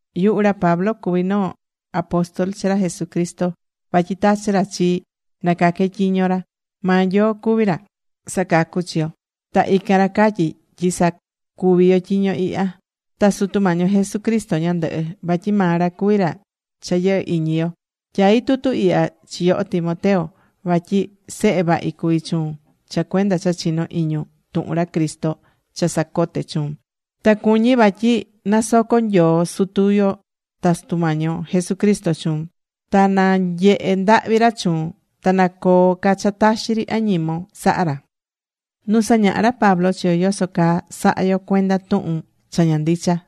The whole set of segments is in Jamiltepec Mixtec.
Yuhu ra Pablo cuví noo apóstol chi ra Jesucristo vatyi tachi̱ ra chii na caque tyiño ra. Maa Nyoo cuví ra sacacú chi yo. Ta ican ra catyí tyi sa̱cuvi tyiño ihya, ta Sutu Mañi yo Jesucristo ñandɨhɨ. Vatyi maa ra cuví ra cha yɨhɨ́ iñi yo. Tyaí tutu ihya chi yoho Timoteo vatyi sehe vahi cuví chuun cha cuenda cha chinó iñun tuhun ra Cristo cha sacote̱ chuun. Ta cuñí vatyi nasoco Nyoo Sutu yo ta Sutu Mañi yo Jesucristo chuun. Ta na nyehe ndahvi ra chuun. Ta na coo ca cha taxi ri añimon saha ra.Nu sañaha̱ ra Pablo chi yo yoso caa saha̱ yo cuenda tuhun cha ña ndicha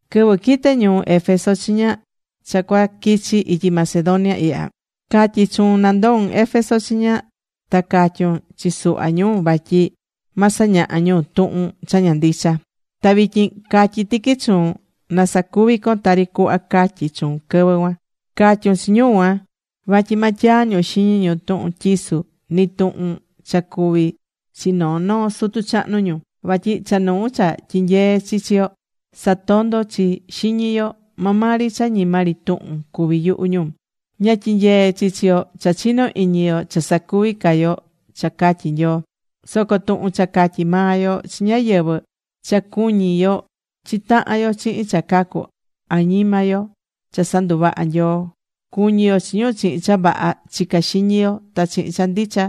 Quɨvɨ quite̱ ñuu Éfeso chiña cha cuaquichi ityi Macedonia ihya, catyi̱ chuun na ndo̱un Éfeso chiña ta ca̱tyun chi suhva ñu vatyi ma sañaha ñu tuhun cha ña ndicha. Ta vityin catyí tiqui chuun na sacuvi con tari cuhva catyi chuun quɨvɨ cuan. Ca̱tyun chi ñu cuan vatyi ma tyaa ñu xiñi ñu tuhun tyisu, nɨ tuhun cha cuvi̱ chi noo noo sutu chahnu ñu. Vatyi cha nuu cha tyinyeé chi chi yo, satondó chi xiñi yo. Maa maa ri cha ñima ri tuhun cuví yuhu yo. Ña tyinyeé chi chi yo cha chinó iñi yo cha sacuví ca yo cha catyí Nyoo. Soco tuhun cha catyí maa yo chi ñáyɨvɨ, cha cu̱ñi yo chi tahan yo chihin cha cacú añima yo cha sanduvaha̱ Nyoo. Cu̱ñi yo chi ñu chihin cha vaha chicá xiñi yo ta chihin cha ndicha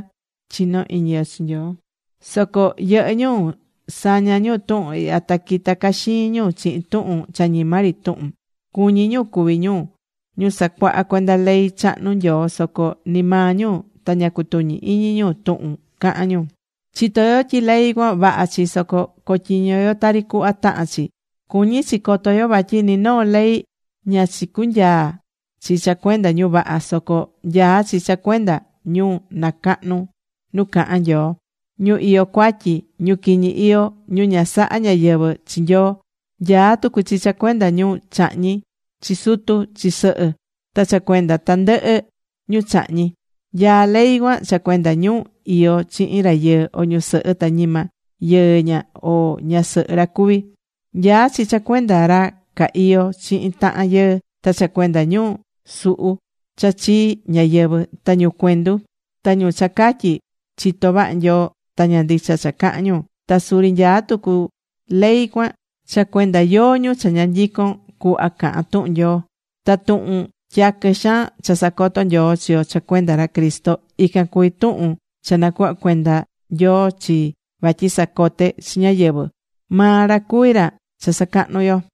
chinó iñi yo chi Nyoo. Soco yɨhɨ́ ñu saña̱ ñu tuhun ihya ta quita caxiin ñu chihin tuhun cha ñima ri tuhun. Cuñí ñu cuvi ñu ñu sacuahá cuenda ley chahnu Nyoo soco ni maa ñu ta ña cutuñí iñi ñu tuhun cahán ñu. Chitó yo tyi ley cuan, vaha chi, soco co̱tyiño yo tari cuhva tahán chi. Cuñí chi coto yo vatyi ni noo ley ña chicunyaa̱ chi cha cuenda ñu vaha. Soco nyaá chi cha cuenda ñu nacahnú nu cahán Nyoo, ñu iyó cuatyi, ñu quiñi iyó, ñu ña saha ñáyɨvɨ chi Nyoo. Nyaá tucu chi cha cuenda ñu chahñí chi sutu, chi sɨhɨ, ta cha cuenda tandɨhɨ ñu chahñí. Nyaá ley cuan cha cuenda ñu iyó chihin rayɨɨ o ñusɨhɨ ta ñima yɨɨ ña o ñasɨhɨ ra cuví. Nyaá chi cha cuenda ra ca iyó chihin tahan yɨɨ, ta cha cuenda ñu suhu cha chii ñáyɨvɨ, ta ñu cuendu, ta ñu cha catyí: “Chito vaha Nyoo”, ta ña ndicha cha cahán ñu. Ta suri nyaá tucu ley cuan cha cuenda yóó ñu cha ña nyicon cuhva cahan tuhún Nyoo. Ta tuhun tyaquɨ xaan cha sacoto Nyoo chi yo cha cuenda ra Cristo, ican cuví tuhun cha nacuhva̱ cuenda Nyoo chii vatyi sacote chi ñáyɨvɨ. Maa ra cuví ra cha sacahnú yo.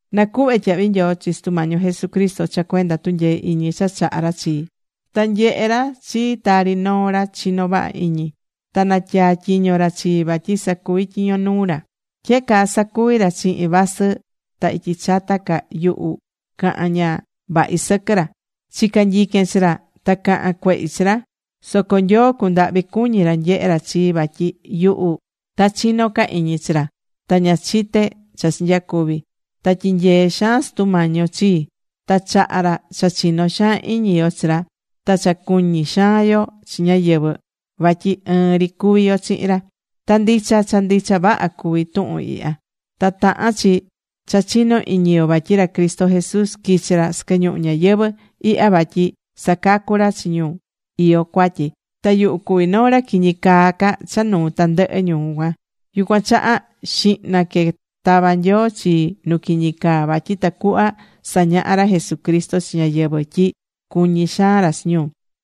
Nacuhvé tyahvi nyoo chi Sutu Mañi yo Jesucristo cha cuenda tunyee iñi cha chaha ra chii ta nyehe̱ ra chi tari noo ra chinó vaha iñi, ta natyaa tyiño ra chii vatyi sacuví tyiño nuu ra. Tyehe caa sacuvi ra chihin vasɨ ta ityi chata ca yuhu caha̱n ña vahi sɨquɨ ra. Chica̱ nyiquen chi ra ta caha̱n cuehi chi ra. Soco Nyoo cundahvi̱ cuñi̱ ra nyehe ra chii, vatyi yuhu ta chino ca iñi chi ra, ta ña chite̱ cha chinyacuvi̱. Ta tyinyee̱ xaan Sutu Mañi yo chii. Ta chaha̱ ra cha chino xaan iñi yo chi ra, ta cha cuñí xaan yo chi ñáyɨvɨ vatyi ɨɨn ri cuví yo chihin ra. Ta ndicha, cha ndicha vaha cuví tuhun ihya. Ta tahán chi cha chino iñi yo, vatyi ra Cristo Jesús quichi̱ ra sɨquɨ ñuhu ñayɨvɨ̱ ihya vatyi sacacú ra chi ñu iyó cuatyi. Ta yuhu cuví noo ra quiñi caa ca cha nuu tandɨhɨ ñu cuan. Yucuan chaha xihna que tava̱ Nyoo chii nu quiñi caa vatyi tacuhva sañaha ra Jesucristo chi ñáyɨvɨ tyi cuñí xaan ra chi ñu.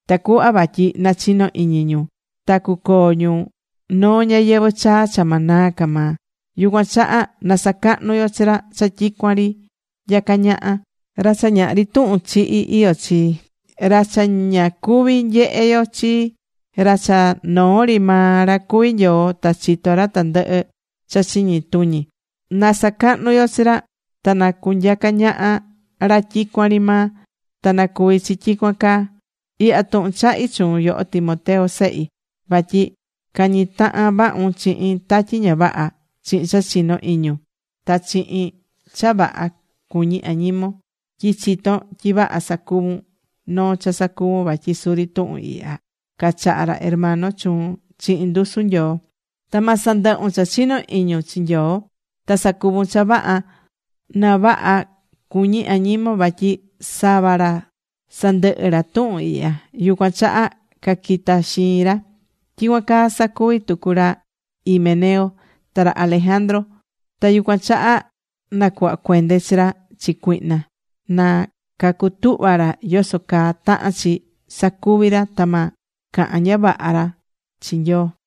Tacuhva vatyi nachino iñi ñu ta cucoo ñu noo ñayɨvɨ̱ chaa cha ma naa ca maa. Yucuan chaha na sacahnu yo chi ra cha tyicuan ri nyacá ñaha, ra cha ñahri tuhun chihi iyó chi, ra cha ña cuví nyehe yo chi, ra cha noo ri maa ra cuví Nyoo ta chitó ra tandɨhɨ cha chiñi tuñi. Na sacahnu yo chi ra ta na cunyaca ñaha ra tyicuan ri maa. Ta na cuvi chi tyicuan caa. Ihya tuhun chahí chuun, yoho Timoteo sehi, vatyi ca̱ñi tahan vahun chihin tatyi ña vaha chihin cha chinó iñun, ta chihin cha vaha cuñí añimon tyi chitón tyi vaha sacuvun noo cha sacuvún vatyi suri tuhun ihya cachaha̱ ra hermano chuun chihin ndusu Nyoo. Ta ma sandɨhun cha chinó iñun chi Nyoo ta sa̱cuvun cha vaha na vaha cu̱ñi añimon. Vatyi sava ra sandɨhɨ ra tuhun ihya, yucuan chaha caquita̱ xiin ra. Tyicuan caa sacuvi̱ tucu ra Himeneo ta ra Alejandro. Ta yucuan chaha nacuhva̱ cuende chi ra chi cuihna, na cacutuhva ra yoso caa tahán chi sacuvi ra ta ma cahan ña vaha ca ra chi Nyoo.